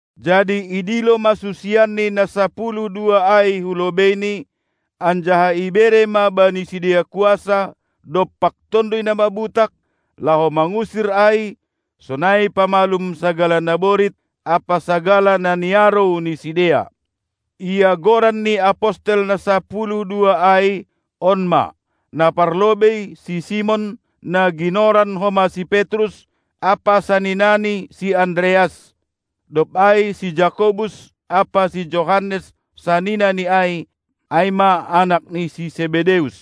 Jadi idilo ma susianNi na sapuluh dua ai hu lobeiNi, anjaha ibere ma bani sidea kuasa dompak tonduy na mabutak, laho mangusir ai, sonai pamalum sagala na borit ampa sagala na niarou ni sidea. Ia goran ni apostel na sapuluh dua ai, on ma: Na parlobei; si Simon, na ginoran homa si Petrus, ampa saninani si Andreas; dob ai si Jakobus ampa si Johannes saninani ai, ai ma anak ni si Sebedeus;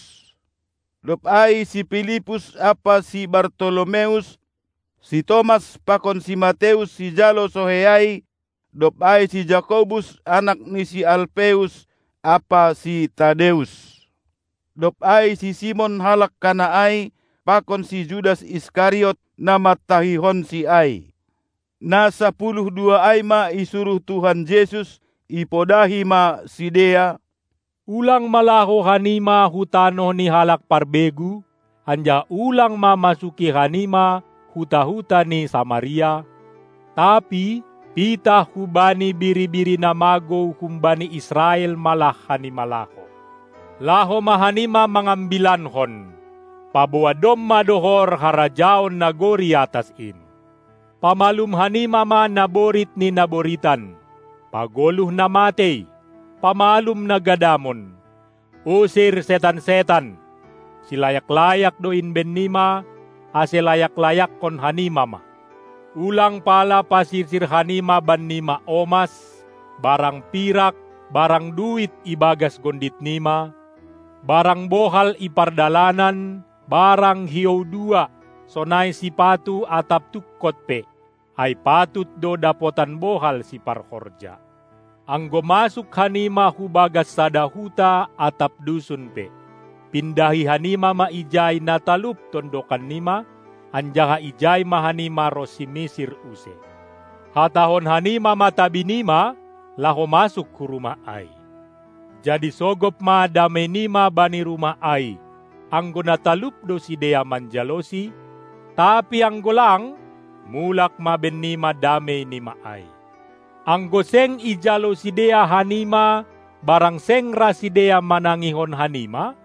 dob ai si Pilippus ampa si Bartolomeus; si Tomas pakon si Mateus, sijalo sohei ai; dob ai si Jakobus anak ni Alpeus ampa si Tadeus; dob ai si Simon, halak Kana ai, pakon si Judas Iskariot, na mantahihonSi ai. Na sapuluh dua ai ma isuruh Tuhan Jesus, ipodahi ma sidea: Ulang ma laho hanima hu tanoh ni halak parbegu, anjaha ulang ma masuki hanima huta-huta ni Samaria, tapi pitah hubani biri-biri na magou humbani Israel ma lah hanima laho. Laho ma hanima mangambilankon, paboa domma dohor harajaon nagori atas in. Pamalum hanima ma naborit ni na boritan, pagoluh na matei, pamalum na gadamon, usir setan-setan! Silayak-layak do in bennima, ase layak-layakkon hanima ma! Ulang pala pasirsir hanima bennima omas barang pirak barang duit ibagas gonditnima, barang bohal i pardalanan barang hiou dua, sonai sipatu atap tungkot pe, ai patut do dapotan bohal siparhorja. Anggo masuk hanima hu bagas sada huta atap dusun pe, pindahi hanima ma ijai na talup tondokannima, anjaha ijai ma hanima ronsi misir use. Hatahon hanima ma tabinima, laho masuk hu rumah ai. Jadi sogop ma dameinima bani rumah ai, anggo na talup do sidea manjalosi, tapi anggo lang, mulak ma bennima dameinima ai. Anggo seng ijalo sidea hanima barang seng ra sidea manangihon hanima,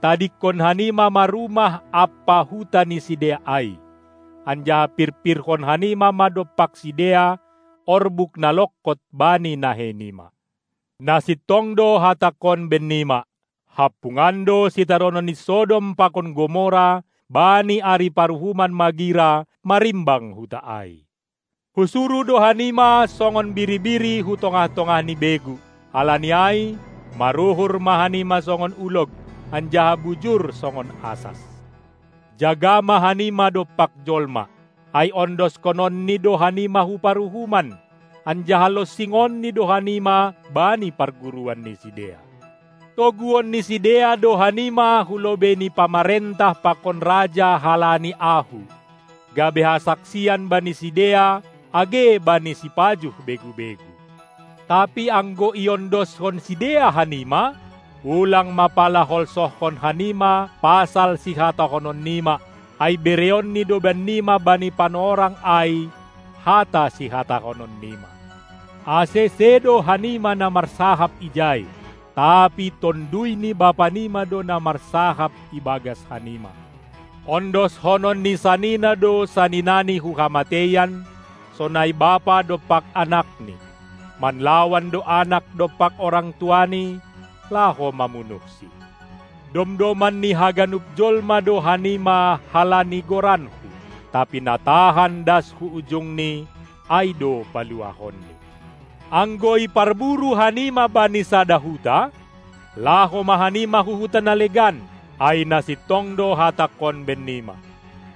tadingkon hanima ma rumah ampa huta ni sidea ai, anjaha pirpirhon hanima ma dompak sidea orbuk na longkot bani naheinima. Na sintong do hatangkon bennima: Hampungan do sitaronon ni Sodom pakon Gomora bani ari paruhuman magira marimbang huta ai. Husuruh do hanima songon biri-biri hu tongah-tongah ni begu, halani ai maruhur ma hanima songon ulog, anjaha bujur songon asas. Jaga ma hanima dompak jolma, ai ondoskononni do hanima hu paruhuman, anjaha lonsingonni do hanima bani parguruan ni sidea. Toguon ni sidea do hanima hu lobei ni pamarentah pakon raja halani Ahu, gabe hasaksian bani sidea age bani sipajuh begu-begu. Tapi anggo iondoskon sidea hanima, ulang ma pala holsohkon hanima pasal sihatahononnima, ai bereonNi do bennima bani panorang ai hata sihatahononnima. Ase, sedo hanima na marsahap ijai, tapi Tonduy ni Bapanima do na marsahap ibagas hanima. Ondoskonon ni sanina do saninani hu hamateian, sonai bapa dompak anakni. Manlawan do anak dompak orang tuani, laho mamunuhsi. Domdoman ni haganup jolma do hanima halani goranKu, tapi na tahan das hu ujungni, ai do paluahonNi. Anggo iparburu hanima bani sada huta, laho ma hanima hu huta na legan, ai na sintong do Hatangkon bennima: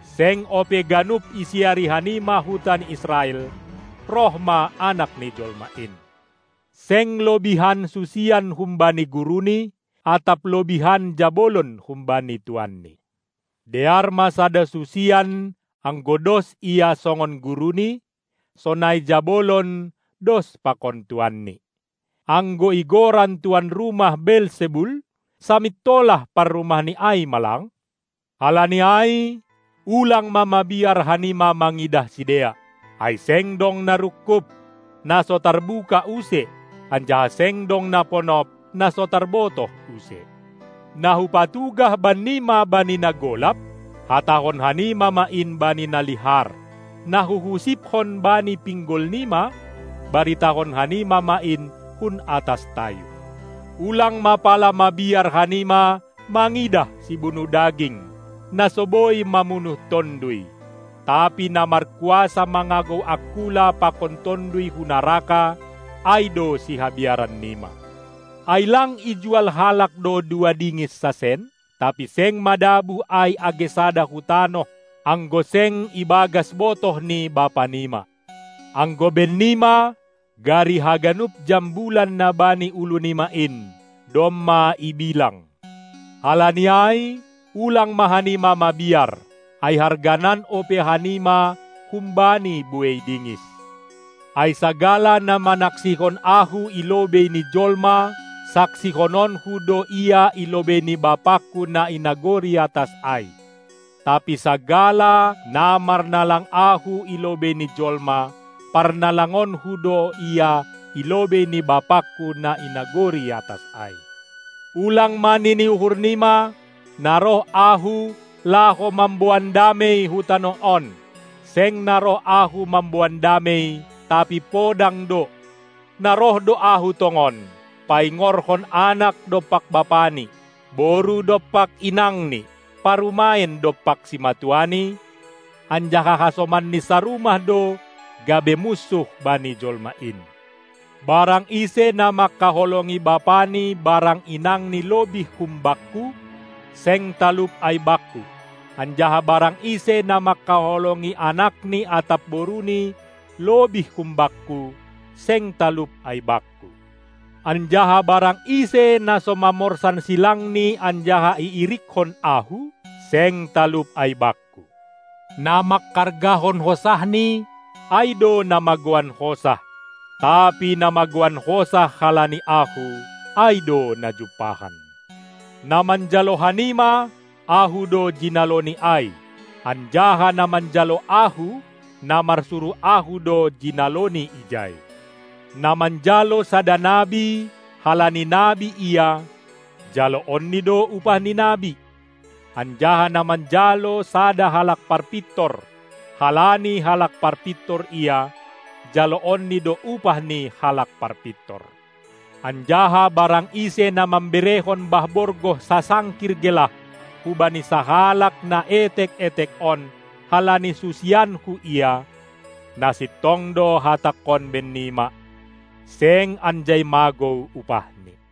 Seng ope ganup isiari hanima huta ni Israel, roh ma Anak ni jolma in. Seng lobihan susian humbani guruni atap lobihan jabolon humbani tuanni. Dear ma sada susian anggo dos ia songon guruni, sonai jabolon dos pakon tuanni. Anggo igoran tuan rumah Beelsebul, samintolah parrumahni ai ma lang? Halani ai ulang ma mabiar hanima mangidah sidea, ai seng dong na rungkub, na so tarbuka use, anjaha seng dong na ponop, na so tarbotoh use. Na Hupatugah bannima bani na golap, hatahon hanima ma in bani na lihar, na Huhusipkon bani pinggolnima, baritahon hanima ma in hun atas tayub. Ulang ma pala mabiar hanima mangidah sibunuh daging, na so boi mamunuh tonduy; tapi na markuasa mangagou angkula pakon tonduy hu naraka, ai do sihabiarannima. Ai lang ijual halak do dua dingis sasen? Tapi seng madabuh ai age sada hu tanoh, anggo seng ibagas botoh ni Bapanima. Anggo bennima, gari haganup jambulan na bani ulunima in, domma ibilang. Halani ai, ulang ma hanima mabiar, ai harganan ope hanima humbani buei dingis. Ai sagala na manaksihon Ahu i lobei ni jolma, saksihononKu do ia i lobei ni BapangKu na i nagori atas ai, tapi sagala, na marnalang Ahu i lobei ni jolma, parnalangonKu do ia i lobei ni BapangKu na i nagori atas ai. Ulang ma nini uhurnima, na roh Ahu, laho mamboan damei hu tanoh on. Seng na roh Ahu mamboan damei, tapi podang do. Na roh do Ahu tongon, paingorhon anak dompak bapani, boru dompak inangni, parumaen dompak simatuani, anjaha hasomanni sarumah do gabe munsuh bani jolma in. Barang ise na mangkaholongi bapani barang inangni lobih hum Bakku, seng talup ai Bakku; anjaha barang ise na mangkaholongi anakni atap boruni lobih hum Bakku, seng talup ai Bakku. Anjaha barang ise na so mamorsan silangni anjaha iirikkon Ahu, seng talup ai Bakku. Na manghargahon hosahni, ai do na magouan hosah, tapi na magouan hosah halani Ahu, ai do na jumpahan. Na manjalo hanima, Ahu do jinaloni ai, anjaha na manjalo Ahu, na marsuruh Ahu do jinaloni ijai. Na manjalo sada nabi, halani nabi ia, jaloonni do upah ni nabi, anjaha na manjalo sada halak parpintor, halani halak parpintor ia, jaloonni do upah ni halak parpintor. Anjaha barang ise na mamberehon bah borgoh sasangkir gelah hubani sahalak na etek-etek on, halani susianKu ia, na sintong do Hatangkon bennima, seng anjai magou upahni.